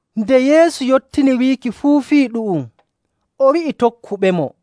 Nde Yeesu yottini wiiki fuu fii ɗu'um, o wi'i tokkuɓemo,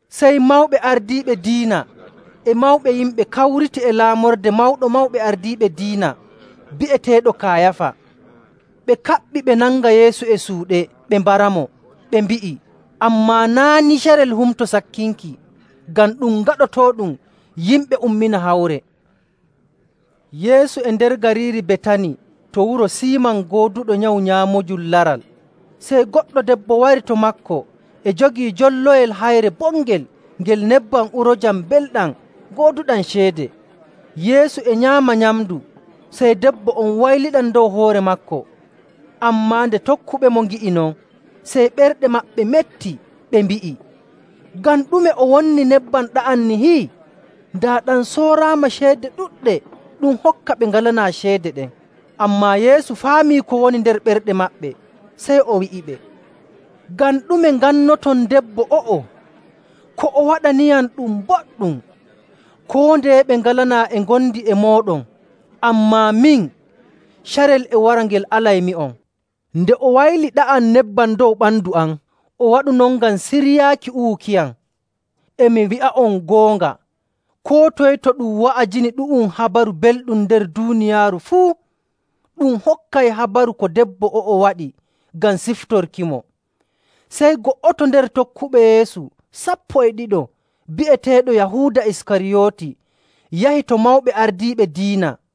Sey mawɓe ardiiɓe diina e mawɓe yimɓe kawriti e laamorde Mawɗo Mawɓe Ardiiɓe Diina bi'eteeɗo Kayaafa. Ɓe kaɓɓi ɓe nanga Yeesu e suuɗe ɓe mbaramo. Ɓe mbi'i, “Ammaa naa' ni carel Humto Sakkinki, ngam ɗum gaɗotooɗum yimɓe ummina hawre.” Yeesu e nder gariiri Betani to wuro Siiman gooduɗo nyawu nyaamoojum laral, sey goɗɗo debbo wari to maako e jogii jolloyel hayre bongel ngel nebbam uroojam mbelɗam gooduɗam ceede. Yeesu e nyaama nyamndu, sey debbo on wayliɗam dow hoore maako.. Ammaa nde tokkuɓemo ngi'i non, sey ɓerɗe maɓɓe metti, ɓe mbi'i, “Ngam ɗume o wonni nebbam ɗa'am nihi? Daa ɗam sooraama ceede ɗuɗɗe, ɗum hokka ɓe ngalanaa ceede ɗen.” Ammaa Yeesu faami ko woni nder ɓerɗe maɓɓe, sey o wi'iɓe, “Ngam ɗume ngannoton debbo o'o? Ko o waɗaniyam ɗum boɗɗum. Koo ndeye ɓe ngalanaa e ngondi e mooɗon, ammaa min, carel e wara ngel alaymi'on.. Nde o wayli ɗa'am nebbam dow ɓandu am, o waɗu non ngam siryaaki uwukiyam. E mi wi'a'on goonga, koo toye to ɗum wa'ajini ɗu'um Habaru Belɗum nder duuniyaaru fuu, ɗum hokkay habaru ko debbo o'o waɗi ngam siftorkimo.” Sey go'oto nder tokkuɓe Yeesu sappo e ɗiɗo bi'eteeɗo Yahuuda Iskariyooti yahi to mawɓe ardiiɓe diina,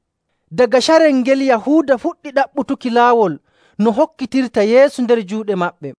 Daga carel ngel Yahuuda fuɗɗi ɗaɓɓutuki laawol no hokkitirta Yeesu nder juuɗe maɓɓe.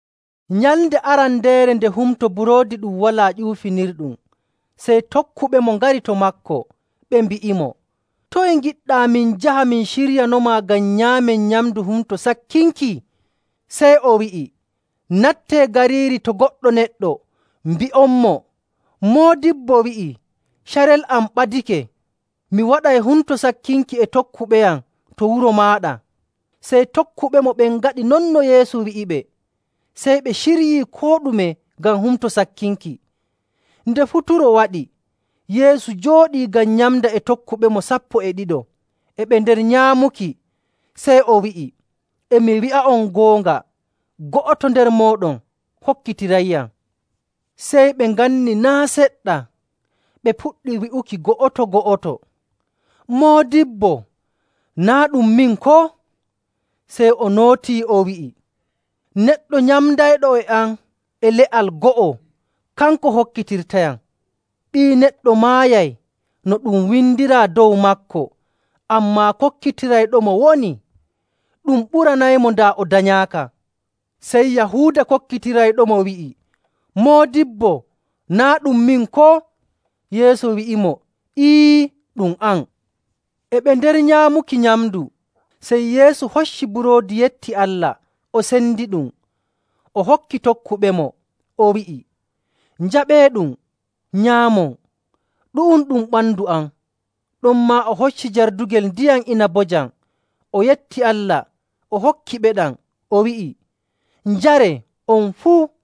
Nyalnde arandeere nde Humto Buroodi Ɗum Walaa Ƴuufinirɗum, sey tokkuɓemo ngari to maako, ɓe mbi'imo, “Toye ngiɗɗaa min njaha min ciryanomaa ngam nyaamen nyamndu Humto Sakkinki?” Sey o wi'i, “Nattee gariiri to goɗɗo neɗɗo mbi'onmo, ‘Moodibbo wi'i: Carel am ɓadake. Mi waɗay Humto Sakkinki e tokkuɓeyam to wuro maaɗa.’” Sey tokkuɓemo ɓen ngaɗi non no Yeesu wi'iɓe, sey ɓe ciryii koo ɗume ngam Humto Sakkinki. Nde futuro waɗi, Yeesu jooɗii ngam nyamda e tokkuɓemo sappo e ɗiɗo. E ɓe nder nyaamuki, sey o wi'i, “E mi wi'a'on goonga, go'oto nder mooɗon hokkitirayyam.” Sey ɓe nganni naa' seɗɗa, ɓe puɗɗi wi'ukimo go'oto‑go'oto, “Moodibbo, naa' ɗum min, koo?” Sey o nootii, o wi'i, “Neɗɗo nyamdayɗo e am e le'al go'o, kanko hokkitirtayam.. Ɓii Neɗɗo maayay no ɗum windiraa dow maako, ammaa kokkitirayɗomo wonii! Ɗum ɓuranaymo daa o danyaaka.” Sey Yahuuda kokkitirayɗomo wi'i, “Moodibbo, naa' ɗum min, koo?” Yeesu wi'imo, “Ee, ɗum an.” E ɓe nder nyaamuki nyamndu, sey Yeesu hocci buroodi yetti Allah, o sendiɗum, o hokki tokkuɓemo, o wi'i, “Njaɓeeɗum, nyaamon. Ɗu'um ɗum ɓandu am.” Ɗonmaa o hocci jardugel ndiyam inabojam, o yetti Allah, o hokkiɓeɗam, o wi'i, “Njaree, on fuu,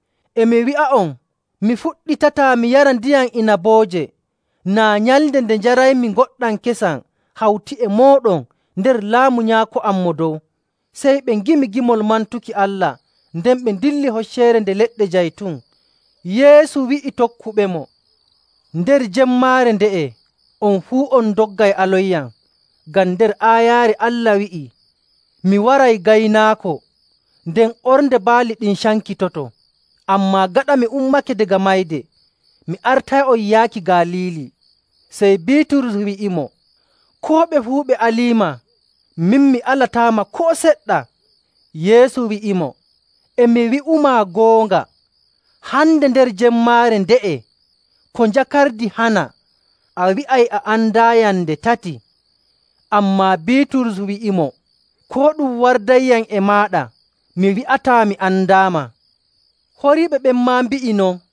E mi wi'a'on, mi fuɗɗitataa mi yara ndiyam inabooje naa nyalnde nde njaraymi ngoɗɗam kesam hawti e mooɗon nder Laamu Nyaako am Mo Dow.” Sey ɓe ngimi gimol mantuki Allah, nden ɓe ndilli Hocceere Nde Leɗɗe Jaytun. Yeesu wi'i tokkuɓemo, “Nder jemmaare nde'e on fuu on ndoggay alonyam, ngam nder aayaare Allah wi'ii, ‘Mi waray gaynaako, nden ornde baali ɗin cankitoto.’. Ammaa gaɗa mi ummake daga mayde, mi artay'on yaaki Galiili.”. Sey Biiturus wi'imo, “Koo ɓe fuu ɓe aliima, min mi alataama koo seɗɗa.” Yeesu wi'imo, “E mi wi'umaa goonga, hande, nder jemmaare nde'e, ko njakardi hana, a wi'ay a andaayam nde tati.” Ammaa Biiturus wi'imo, “Koo ɗum wardayyam e maaɗa, mi wi'ataa mi andaama.” Horiiɓe ɓen maa mbi'i non.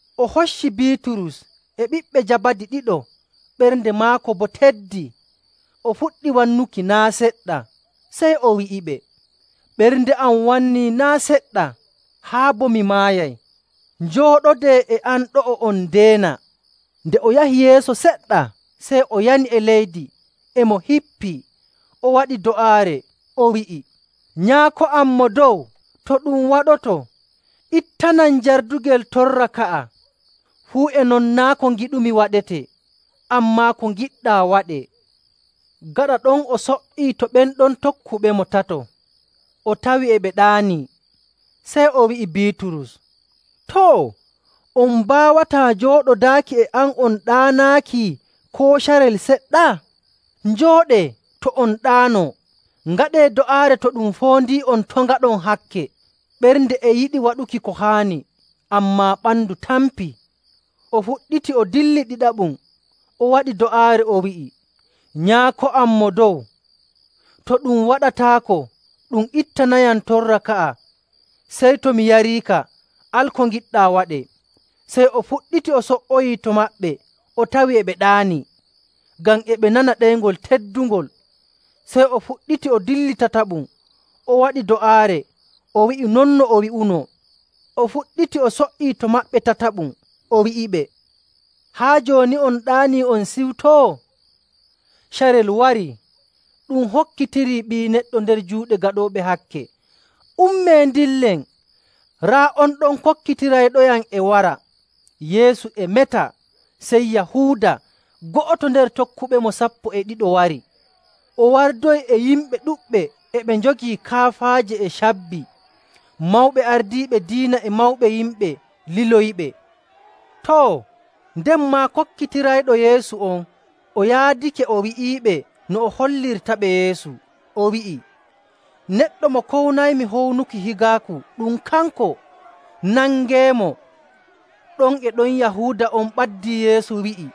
O hocci Biiturus e ɓiɓɓe Jabadi ɗiɗo. Ɓernde maako boo teddi, o fuɗɗi wannuki naa' seɗɗa. Sey o wi'iɓe, “Ɓernde am wannii naa' seɗɗa haa bo mi maayay. Njooɗodee e am ɗo'o on ndeena.” Nde o yahi yeeso seɗɗa, sey o yani e leydi e mo hippii, o waɗi do'aare, o wi'i, “Nyaako am Mo Dow, to ɗum waɗoto, ittanam jardugel torra ka'a. Fuu e non naa' ko ngiɗumi waɗetee, ammaa ko ngiɗɗaa waɗee.” Gaɗa ɗon o so''ii to ɓen ɗon tokkuɓemo tato, o tawi e ɓe ɗaanii, sey o wi'i Biiturus, “Too, on mbaawataa jooɗodaaki e am on ɗaanaaki koo carel seɗɗa? Njooɗee, to' on ɗaano, ngaɗee do'aare to ɗum foondii'on to' ngaɗon hakke. Ɓernde e yiɗi waɗuki ko haani, ammaa ɓandu tampii.” O fuɗɗiti o dilli ɗiɗaɓum, o waɗi do'aare, o wi'i, “Nyaako am Mo Dow, to ɗum waɗataako ɗum ittanayam torra ka'a, sey to mi yariika, al ko ngiɗɗaa waɗee.” Sey o fuɗɗiti o so''oyii to maɓɓe, o tawi e ɓe ɗaanii, ngam e ɓe nana ɗeyngol teddungol. Sey o fuɗɗiti o dilli tataɓum o waɗi do'aare, o wi'i non no o wi'uno. O fuɗɗiti o so''ii to maɓɓe tataɓum, o wi'iɓe, “Haa jooni on ɗaanii, on ciwtoo? Carel warii. Ɗum hokkitirii Ɓii Neɗɗo nder juuɗe gaɗooɓe hakke. Ummee ndillen! Raa on ɗon kokkitirayɗoyam e wara.” Yeesu e meta, sey Yahuuda, go'oto nder tokkuɓemo sappo e ɗiɗo wari. O wardoyi e yimɓe ɗuɗɓe e ɓe njogii kaafaaje e cabbi. Mawɓe ardiiɓe diina, e mawɓe yimɓe liloyiɓe. Too, nden maa kokkitirayɗo Yeesu on o yaadake o wi'iiɓe no o hollirtaɓe Yeesu, o wi'i, “Neɗɗo mo kownaymi hownuki higaaku ɗum kanko. Nangeemo.” Ɗon e ɗon Yahuuda on ɓaddii Yeesu, wi'i,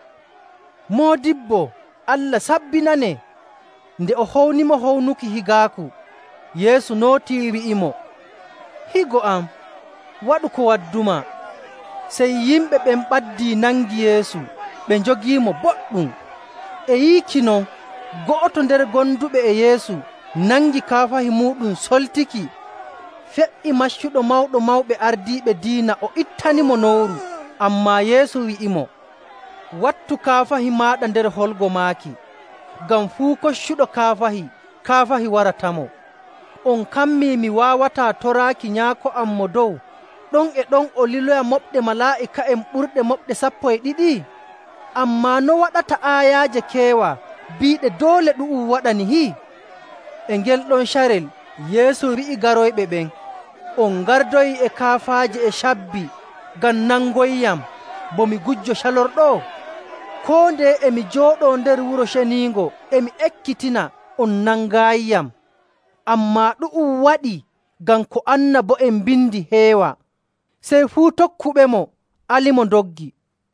“Moodibbo, Allah sabbinanee!” Nden o hownimo hownuki higaaku. Yeesu nootii, wi'imo, “Higo am, waɗu ko waddumaa.” Sey yimɓe ɓen ɓaddii nangi Yeesu ɓe njogiimo boɗɗum. E yiiki non, go'oto nder gonduɓe e Yeesu nangi kaafahi muuɗum soltiki, fe''i maccuɗo Mawɗo Mawɓe Ardiiɓe Diina o ittanimo nowru. Ammaa Yeesu wi'imo, “Wattu kaafahi maaɗa nder holgo maaki. Ngam fuu koccuɗo kaafahi, kaafahi waratamo. On kammii mi waawataa toraaki Nyaako am Mo Dow, ɗon e ɗon o liloya moɓɗe malaa'ika'en ɓurɗe moɓɗe sappo e ɗiɗi? Ammaa no waɗata aayaaje keewa biiɗe doole ɗu'um waɗa nihi?” E ngel ɗon carel Yeesu wi'i garoyɓe ɓen, “On ngardoyi e kaafaaje e cabbi ngam nangoyyam bo mi gujjo calorɗo? Koo ndeye e mi jooɗoo nder Wuro Ceniingo e mi ekkitina, on nangaayiyam.. Ammaa ɗu'um waɗii ngam ko annabo'en mbindi heewa.” Sey fuu tokkuɓemo alimo, ndoggi.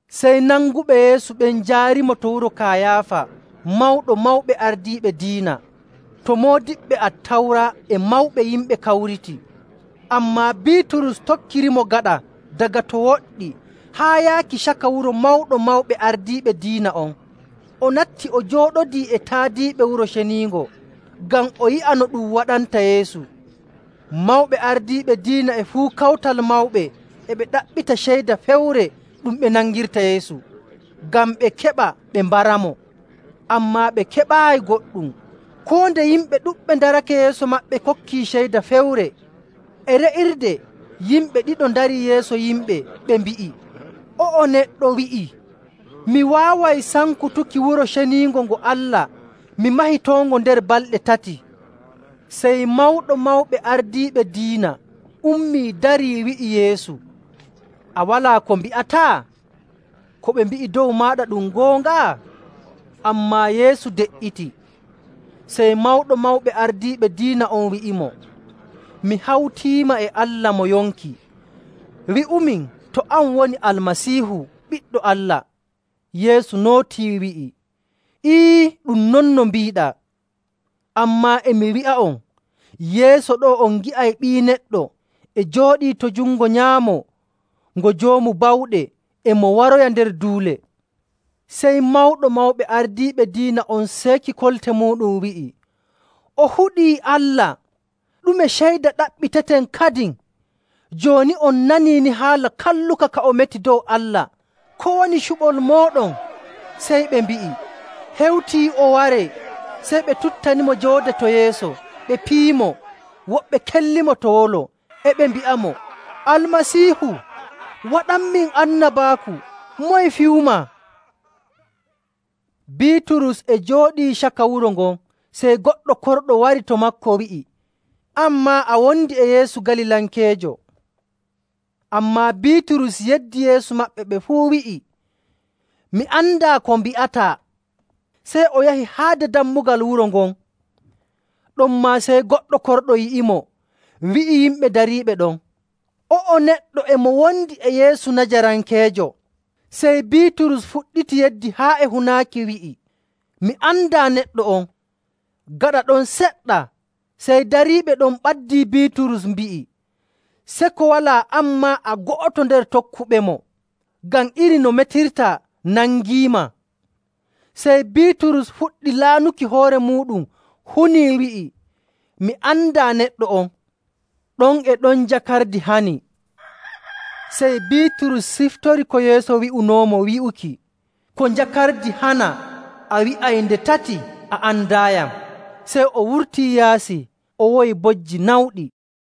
Sey nanguɓe Yeesu ɓen njaarimo to wuro Kayaafa Mawɗo Mawɓe Ardiiɓe Diina, to moodiɓɓe Attawra e mawɓe yimɓe kawriti. Ammaa Biiturus tokkirimo gaɗa daga to woɗɗi haa yaaki caka wuro Mawɗo Mawɓe Ardiiɓe Diina on. O natti o jooɗodii e taadiiɓe Wuro Ceniingo, ngam o yi'a no ɗum waɗanta Yeesu. Mawɓe ardiiɓe diina e fuu Kawtal Mawɓe e ɓe ɗaɓɓita ceyda fewre ɗum ɓe nangirta Yeesu, ngam ɓe keɓa ɓe mbaramo. Ammaa ɓe keɓaayi goɗɗum, koo nde yimɓe ɗuɗɓe ndarake yeeso maɓɓe kokki ceyda fewre. E re'irde, yimɓe ɗiɗo ndarii yeeso yimɓe, ɓe mbi'i, “O'o neɗɗo wi'ii, ‘Mi waaway sankutuki Wuro Ceniingo ngo Allah, mi mahitoongo nder balɗe tati.’” Sey Mawɗo Mawɓe Ardiiɓe Diina ummii darii wi'i Yeesu, “A walaa ko mbi'ataa? Ko ɓe mbi'i dow maaɗa ɗum goonga?” Ammaa Yeesu de''iti. Sey Mawɗo Mawɓe Ardiiɓe Diina on wi'imo, “Mi hawtiima e Allah mo yonki, wi'umin to an woni Almasiihu, Ɓiɗɗo Allah.” Yeesu nootii, wi'i, “Ee, ɗum non no mbiiɗaa. Ammaa e mi wi'a'on, yeeso ɗo'o on ngi'ay Ɓii Neɗɗo e jooɗii to jungo nyaamo ngo Joomu Bawɗe e mo waroya nder duule.”. Sey Mawɗo Mawɓe Ardiiɓe Diina on seeki kolte muuɗum wi'i, “O huɗii Allah. Ɗume ceyda ɗaɓɓiteten kadin? Jooni on nanii ni haala kalluka ka o meti dow Allah. Ko woni cuɓol mooɗon?”. Sey ɓe mbi'i, “Hewtii o waree!” Sey ɓe tuttanimo joode to yeeso, ɓe piyimo, woɓɓe kellimo to wolo,. e ɓe mbi'amo, “Almasiihu, waɗanmin annabaaku! Moye fiyumaa?” Biiturus e jooɗii caka wuro ngon, sey goɗɗo korɗo wari to maako wi'i, “An maa, a wondi e Yeesu Galilankeejo!” Ammaa Biiturus yeddi yeeso maɓɓe ɓe fuu wi'i, “Mi andaa ko mbi'ataa!” Sey o yahi haade dammugal wuro ngon. Ɗonmaa sey goɗɗo korɗo yi'imo, wi'i yimɓe dariiɓe ɗon, “O'o neɗɗo e mo wondi e Yeesu Najarankeejo!” Sey Biiturus fuɗɗiti yeddi haa e hunaaki, wi'i, “Mi andaa neɗɗo on!” Gaɗa ɗon seɗɗa, sey dariiɓe ɗon ɓaddii Biiturus, mbi'i, “Seko walaa an maa a go'oto nder tokkuɓemo, ngam iri no metirtaa nangiima.” Sey Biiturus fuɗɗi laanuki hoore muuɗum hunii wi'i, “Mi andaa neɗɗo on!” Ɗon e ɗon njakardi hani. Sey Biiturus siftori ko Yeesu wi'unoomo wi'uki, “Ko njakardi hana a wi'ay nde tati a andaayam.” Sey o wurtii yaasi o woyi bojji nawɗi.